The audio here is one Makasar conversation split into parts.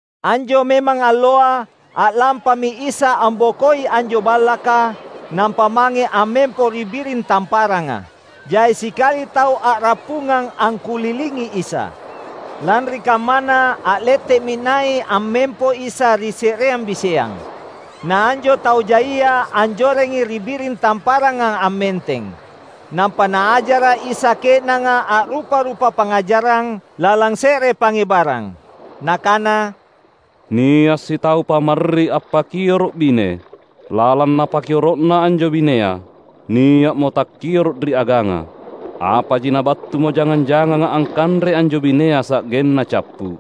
Anjo memang alloa, a’lampami Isa ambokoi anjo ballaka, nampa mange ammempo ri biring tamparanga. Jai sikali tau a’rappungang angkulilingi Isa. Lanri kammana a’lette’mi nai’ ammempo Isa ri se’reang biseang. Na anjo tau jaia anjorengi ri biring tamparanga ammenteng. Nampa Naajara’ Isa ke’nanga a’rupa-rupa pangngajarang, lalang se’re pangngebarang. Nakana, "Nia’ sitau pamarri appakioro’ bine. Lalang napakioro’na anjo binea, nia’mo takkioro’ ri aganga. Apaji nabattumo jangang-janganga angkanrei anjo binea sa’genna cappu’.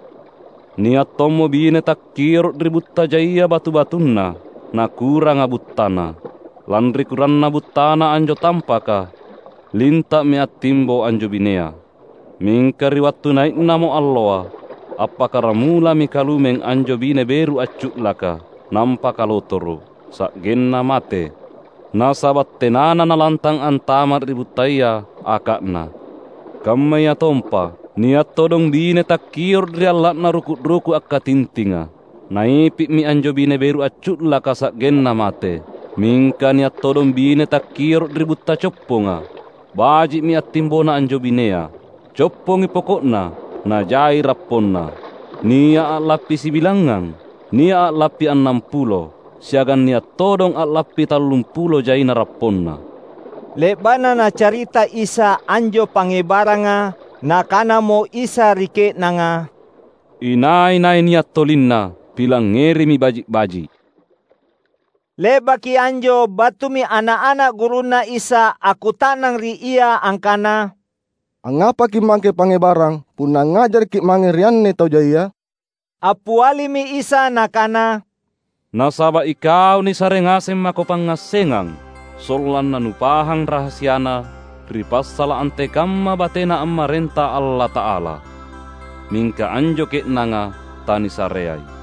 Nia’ tommo bine takkioro’ ri butta jaia batu-batunna, na kuranga buttana. Lanri kuranna buttana anjo tampaka, linta’mi attimbo anjo binea. Mingka ri wattu nai’namo alloa, appakaramulami kalumeng anjo bine beru accu’laka; nampa kalotoro’, sa’genna mate, nasaba’ tenana nalantang antama’ ri buttaya aka’na. Kammayatompa, nia’ todong bine takkioro’ ri alla’na ruku’-ruku’ akkatintinga; naipi’mi anjo bine beru accu’laka sa’genna mate. Mingka nia’ todong bine takkioro’ ri butta copponga. Baji’mi attimbona anjo binea, coppongi poko’na, najai rapponna; nia’ a’lappi sibilangngang, nia’ a’lappi annampulo, siagang nia’ todong a’lappi tallumpulo jaina rapponna." Le’ba’na Nacarita Isa anjo pangngebaranga, Nakanamo Isa ri ke’nanga, "Inai-nai nia’ tolinna, pilangngerimi baji’-baji’!" Le’baki anjo battumi ana’-ana’ gurunNa Isa akkuta’nang ri Ia angkana, "Angngapa Kimmake pangngebarang punna angngajarakKi’ mange ri anne tau jaia?" Appialimi Isa Nakana, "Nasaba’ ikau nisare ngaseng mako pangngassengang sollanna nupahang rahasiana ri passala’ antekamma batena ammarenta Allata’ala. Mingka anjo ke’nanga tanisareai.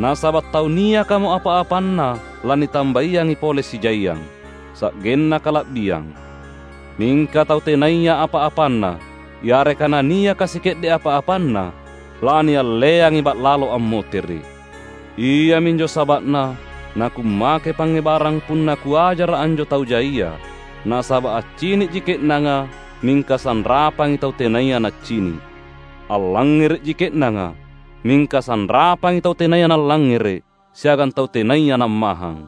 Nasaba’ tau niakamo apa-apanna lanitambaiangi pole sijaiang, sa’genna kala’biang. Mingka tau tenaya apa-apanna, yareka naniaka sike’de’ apa-apanna, lanialleangi ba’lalo ammotere’. Iaminjo saba’na naKummake pangngebarang punna Kuajara’ anjo tau jaia. Nasaba’ accini’ji ke’nanga, mingka sanrapangi tau tenaya naccini’. Allangngere’ji ke’nanga, mingka sanrapangi tau tenaya nallangngere’ siagang tau tenaya nammahang.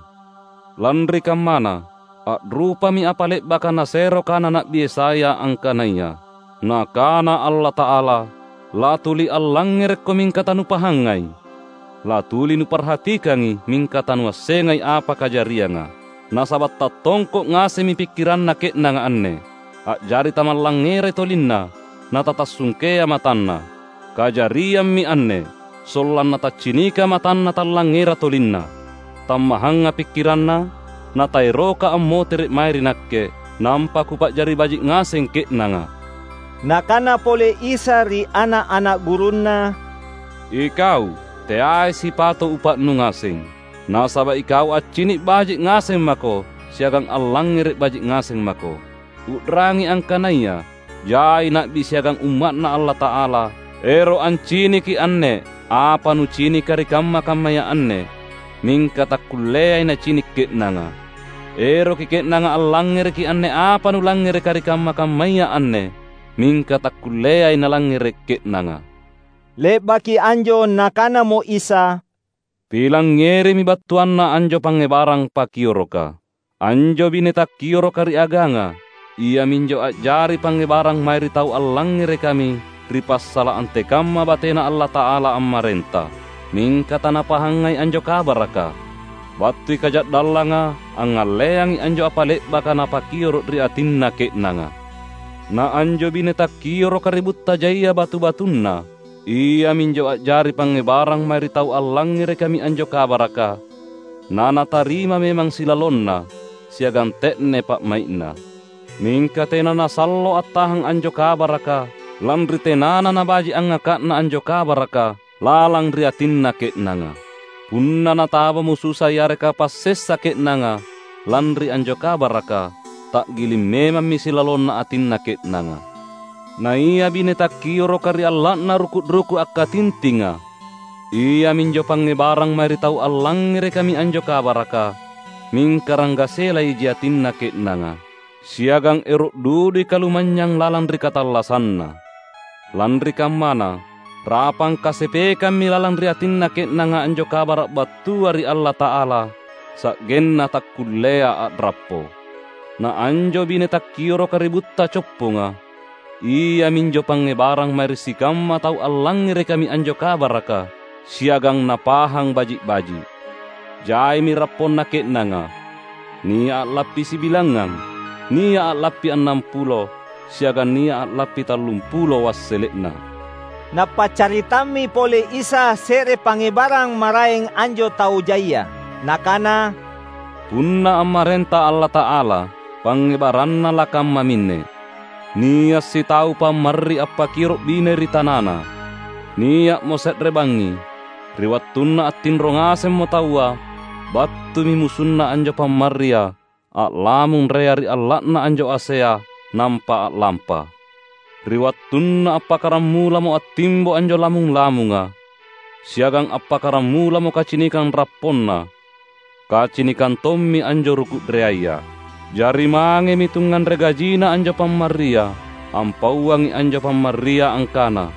Lanri kammana, a’rupami apa le’baka nasero kana Na’bi Yesaya angkanaya, ‘Nakana Allata’ala: Latuli allangngerekko mingka tanupahangai; Latuli nuparhatikangi mingka tanuassengai apa kajarianga. Nasaba’ tattongko’ ngasemmi pikkiranna ke’nanga anne, a’jari tamallangngerai tolinna na tatassungkea matanna. Kajariammi anne, sollanna taccinika matanna tallangngera tolinna, tammahanga pikkiranna, na taeroka ammotere’ mae ri Nakke, nampa Kupa’jari baji’ ngaseng ke’nanga.’" Nakana pole Isa ri ana’-ana’ gurunNa, "Ikau, teai sipato’ upa’nu ngaseng. Nasaba’ ikau accini’ baji’ ngaseng mako siagang allangngere’ baji’ ngaseng mako. U’rangi, angkanaya jai na’bi siagang umma’Na Allata’ala ero’ anciniki anne apa nucinika ri kamma-kammaya anne, mingka takkulleai nacini’ ke’nanga. Eroki ke’nanga allangngereki anne apa nulangngereka ri kamma-kammaya anne mingka takkulleai nalangngere’ ke’nanga." Le’baki anjo Nakanamo Isa, "Pilangngerimi battuanna anjo pangngebarang pakioroka. Anjo bine takkioroka ri aganga, iaminjo a’jari pangngebarang mae ri tau allangngerekami ri passala’ antekamma bateNa Allata’ala ammarenta, mingka tanapahangai anjo kabaraka. Battui kaja’dallanga angngalleangi anjo apa le’baka nipakioro’ ri atinna ke’nanga. Na anjo bine takkioroka ri butta jaia batu-batunna, iaminjo a’jari pangngebarang mae ri tau allangngerekami anjo kabaraka, na natarima memang silalonna siagang te’ne pa’mai’na. Mingka tena nasallo attahang anjo kabaraka lanri tenana nabaji’ angngaka’na anjo kabaraka lalang ri atinna ke’nanga. Punna natabamo susa yareka passessa ke’nanga lanri anjo kabaraka, ta’giling memammi silalonna atinna ke’nanga. Naia bine takkioroka ri alla’na ruku’-ruku’ akkatintinga, iaminjo pangngebarang mae ri tau allangngerekami anjo kabaraka, mingka ranggasela iji atinna ke’nanga, siagang ero’ dudui kalumanynyang lalang ri katallassanna. Lanri kammana, rapang kasepekammi lalang ri atinna ke’nanga anjo Kabara’ battua ri Allata’ala, sa’genna takkullea a’rappo. Na anjo bine takkioroka ri butta copponga, iaminjo pangngebarang mae ri sikamma tau allangngerekami anjo kabaraka siagang napahang baji’-baji’. Jaimi rapponna ke’nanga, nia’ a’lappi sibilangngang, nia’ a’lappi annampulo, siagang nia’ a’lappi tallumpulo wassele’na." Napaccaritammi pole Isa se’re pangngebarang maraeng anjo tau jaia. Nakana, "Punna ammarenta Allata’ala, pangngebaranna lakammaminne: Nia’ sitau pamarri appakioro’ bine ri tanana. Nia’mo se’re bangngi, ri wattunna attinro ngasemmo taua, battumi musunna anjo pamarria a’lamung rea ri alla’na anjo asea nampa a’lampa. Ri wattunna appakkaramulamo attimbo anjo lamung-lamunga, siagang appakkaramulamo kacinikang rapponna, kacinikang tommi anjo ruku’ reaya. Jari mangemi tungnganre gajina anjo pamarria ampauangi anjo pamarria angkana,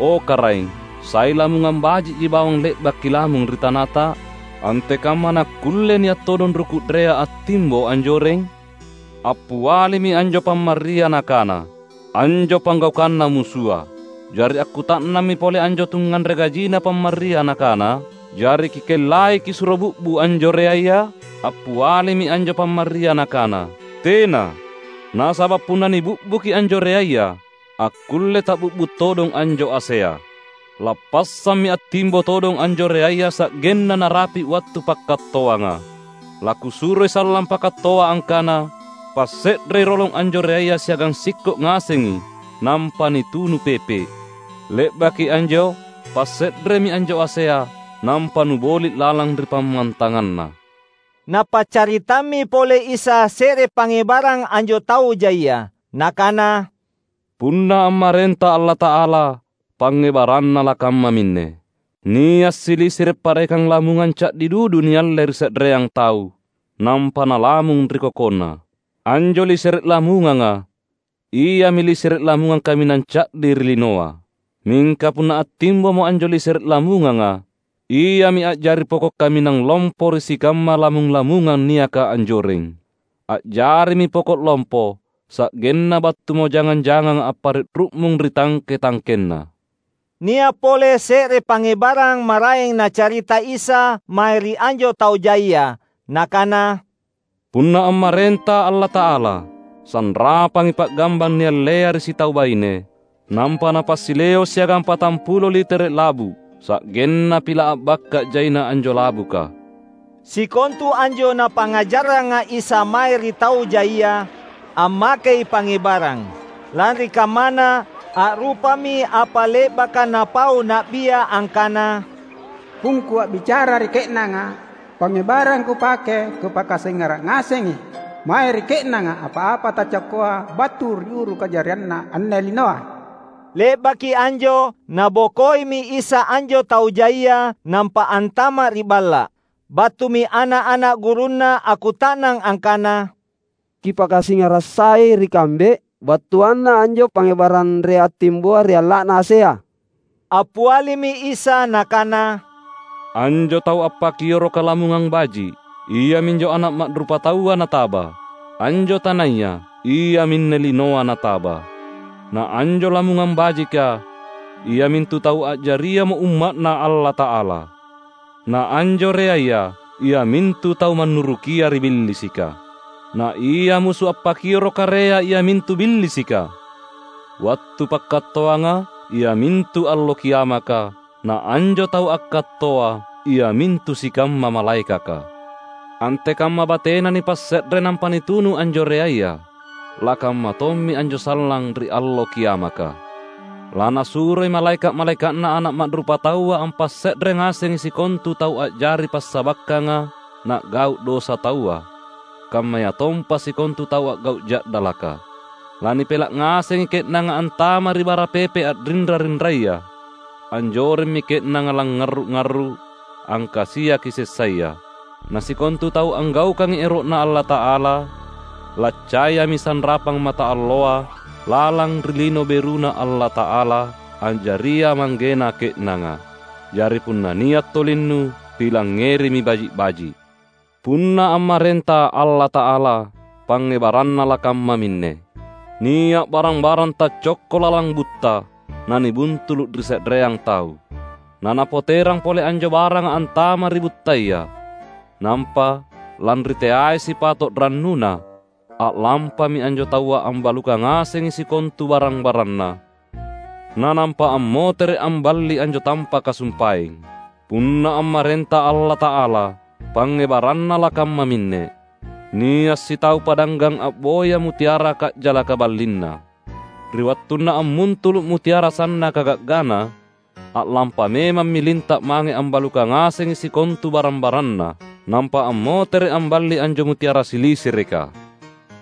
‘O Karaeng, sai lamungang baji’ji bawang le’ba’ kilamung ri tanata? Antekamma nakkulle nia’ todong ruku’ rea attimbo anjoreng?’ Appialimi anjo pamarria nakana, ‘Anjo panggaukanna musua.’ Jari akkuta’nammi pole anjo tungnganre gajina pamarria nakana, ‘Jari kikellai kisuro bi’bu’ anjo reaya?’ Appialimi anjo pamarria nakana, ‘Tena, nasaba’ punna nibi’buki anjo reaya, akkullei ta’bi’bu’ todong anjo asea. Lappassammi attimbo todong anjo reaya sa’genna narapi’ wattu pakkattoanga. Lakusuroi sallang pakattoa angkana: Passe’rei rolong anjo reaya siagang sikko’ ngasengi nampa nitunu pepe’. Le’baki anjo passe’remi anjo asea, nampa nuboli’ lalang ri pammantanganna.’" Napaccaritammi pole Isa se’re pangngebarang anjo tau jaia. Nakana, "Punna ammarenta Allata’ala, pangngebaranna lakammaminne: Nia’ silisere’ parekang lamungang ca’di dudu nialle ri se’reang tau, nampa nalamung ri kokonna. Anjo lisere’ lamunganga, iami lisere’ lamungang kaminang ca’di ri linoa. Mingka punna attimbomo anjo lisere’ lamunganga, iami a’jari poko’ kaminang lompo ri sikamma lamung-lamungang niaka anjoreng. A’jarimi poko’ lompo, sa’genna battumo jangang-janganga appare’ ru’mung ri tangke-tangkenna." Nia’ pole se’re pangngebarang maraeng Nacarita Isa mae ri anjo tau jaia. Nakana, "Punna ammarenta Allata’ala, sanrapangi pa’gambang niallea ri sitau baine, nampa napasileo’ siagang patampulo litere’ labu’. Sa’genna pila’ a’bakka’ jaina anjo labuka!" Sikontu anjo Napangngajarranga Isa mae ri tau jaia, ammakei pangngebarang. Lanri kammana, a’rupami apa le’baka napau na’bia angkana, "PungKu a’bicara ri ke’nanga pangngebarang Kupake Kupakasingara’ ngasengi mae ri ke’nanga apa-apa taccokkoa battu ri uru kajarianna anne linoa." Le’baki anjo, Nabokoimi Isa anjo tau jaia, nampa antama’ ri balla’. Battumi ana’-ana’ gurunNa akkuta’nang angkana, "Kipakasingara’ sai ri kambe battuanna anjo pangngebarang rea attimboa ri alla’na asea." Appialimi Isa Nakana, "Anjo tau appakioroka lamungang baji’, iaminjo Ana’ Ma’rupataua nataba. Anjo tanaya, iaminne linoa nataba. Na anjo lamungang bajika, iamintu tau a’jariamo umma’Na Allata’ala. Na anjo reaya, iamintu tau mannurukia ri Billisika. Na ia musu appakioroka rea iamintu Billisika. Wattu pakkattoanga, iamintu Allo Kiamaka, na anjo tau akkattoa, iamintu sikamma malaekaka. Antekamma batena nipasse’re nampa nitunu anjo reaya, lakamma tommi anjo sallang ri Allo Kiamaka. LaNasuroi malaeka’-malaeka’Na Ana’ Ma’rupataua ampasse’re ngasengi sikontu tau a’jari passabakkanga na’gau’ dosa taua, kammayatompa sikontu tau a’gau’ ja’dalaka. Lanipela’ ngasengi ke’nanga antama’ ri bara pepe’ a’rinra-rinraya; anjoremmi ke’nanga langngarru’-arru’, angkasiaki sessaya. Na sikontu tau anggaukangai ero’Na Allata’ala laccayami sanrapang mataalloa lalang ri Lino BeruNa Allata’ala, a’jaria Manggena ke’nanga. Jari, punna nia’ tolinnu, pilangngerimi baji’-baji’!" "Punna ammarenta Allata’ala, pangngebaranna lakammaminne: Nia’ barang-barang taccokko lalang butta, nanibuntulu’ ri se’reang tau, na napoterang pole anjo baranga antama’ ri buttaya. Nampa, lanri teai sipato’ rannuna, a’lampami anjo taua ambalukang ngasengi sikontu barang-baranna, na nampa ammotere’ amballi anjo tampaka sumpaeng." "Punna ammarenta Allata’ala, pangngebaranna lakammaminne: Nia’ sitau padanggang a’boya mutiara ka’jalaka ballinna. Ri wattunna ammuntulu’ mutiara sannaka ga’gana, a’lampa memammi linta’ mange ambalukang ngasengi sikontu barang-baranna, nampa ammotere’ amballi anjo mutiara silisereka."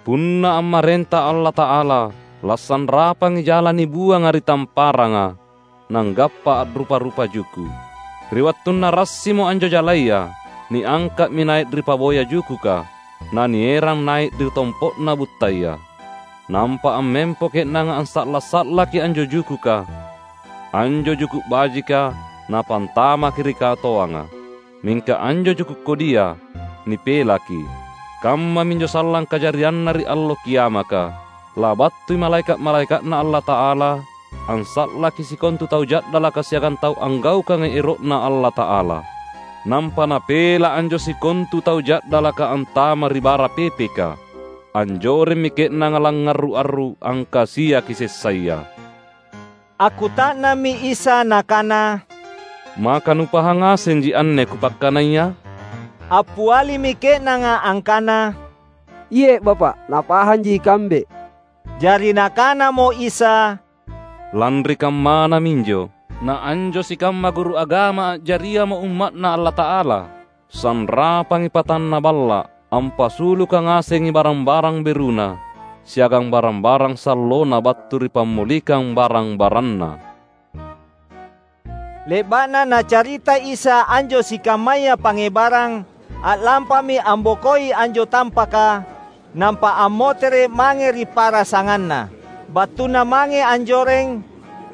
"Punna ammarenta Allata’ala, lasanrapangi jala nibuanga ri tamparanga, nanggappa a’rupa-rupa juku’. Ri wattunna rassimo anjo jalaya, niangka’mi nai’ ri paboya jukuka, na nierang nai’ ri tompo’na buttaya. Nampa ammempo ke’nanga ansa’la’-sa’laki anjo jukuka: anjo juku’ bajika napantamaki ri katoanga, mingka anjo juku’ kodia nipelaki. Kammaminjo sallang kajarianna ri Allo Kiamaka: labattui malaeka’-malaeka’Na Allata’ala ansa’laki sikontu tau ja’dalaka siagang tau anggaukangai ero’Na Allata’ala. Nampa napela’ anjo sikontu tau ja’dalaka antama’ ri bara pepeka. Anjoremmi ke’nanga langngarru’-arru’, angkasiaki sessaya." Akkuta’nammi Isa Nakana, "Maka nupahang ngasenji anne Kupakkanaya?" Appialimi ke’nanga angkana, "Iye’ Bapa’, napahanji ikambe." Jari Nakanamo Isa, "Lanri kammana minjo na anjo sikamma guru agama a’jariamo umma’Na Allata’ala, sanrapangi patanna balla’ ampasuluka ngasengi barang-barang beruna siagang barang-barang sallona battu ri pammolikang barang-baranna." Le’ba’na Nacarita Isa anjo sikammaya pangngebarang, a’lampami ambokoi anjo tampaka, nampa ammotere’ mange ri pa’rasanganNa. Battuna mange anjoreng,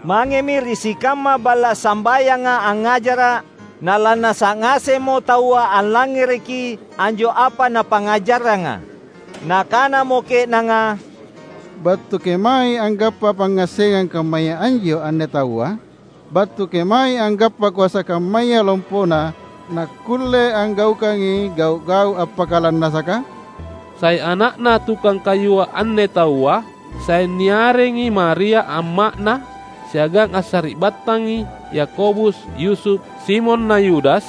mangemi ri sikamma balla’ sambayanga angngajara’; na lannasa’ ngasemmo taua allangngereki anjo apa Napangngajarranga. Nakanamo ke’nanga, "Battu kemaei anggappa pangngassengang kammaya anjo anne Taua? Battu kemaei anggappa koasa kammaya lompona Nakkulle anggaukangi gau’-gau’ appakalannasaka? Sai ana’na tukang kayua anne Taua? Sai niarengi Maria amma’Na, siagang assari’battangi Yakobus, Yusuf, Simon na Yudas?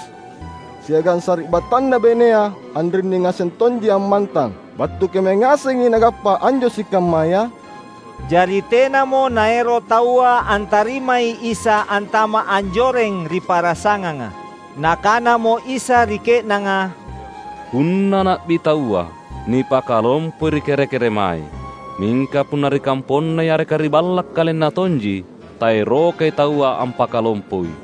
Siagang sari’battanNa bainea anrinni ngaseng tonji ammantang. Battu kemae ngasengi Nagappa anjo sikammaya?" Jari tenamo naero’ taua antarimai Isa antama’ anjoreng ri pa’rasanganga. Nakanamo Isa ri ke’nanga, "Punna na’bi taua, nipakalompoi ri kere-keremae; mingka punna ri kamponNa yareka ri balla’ KalenNa tonji, taerokai taua ampakalompoi."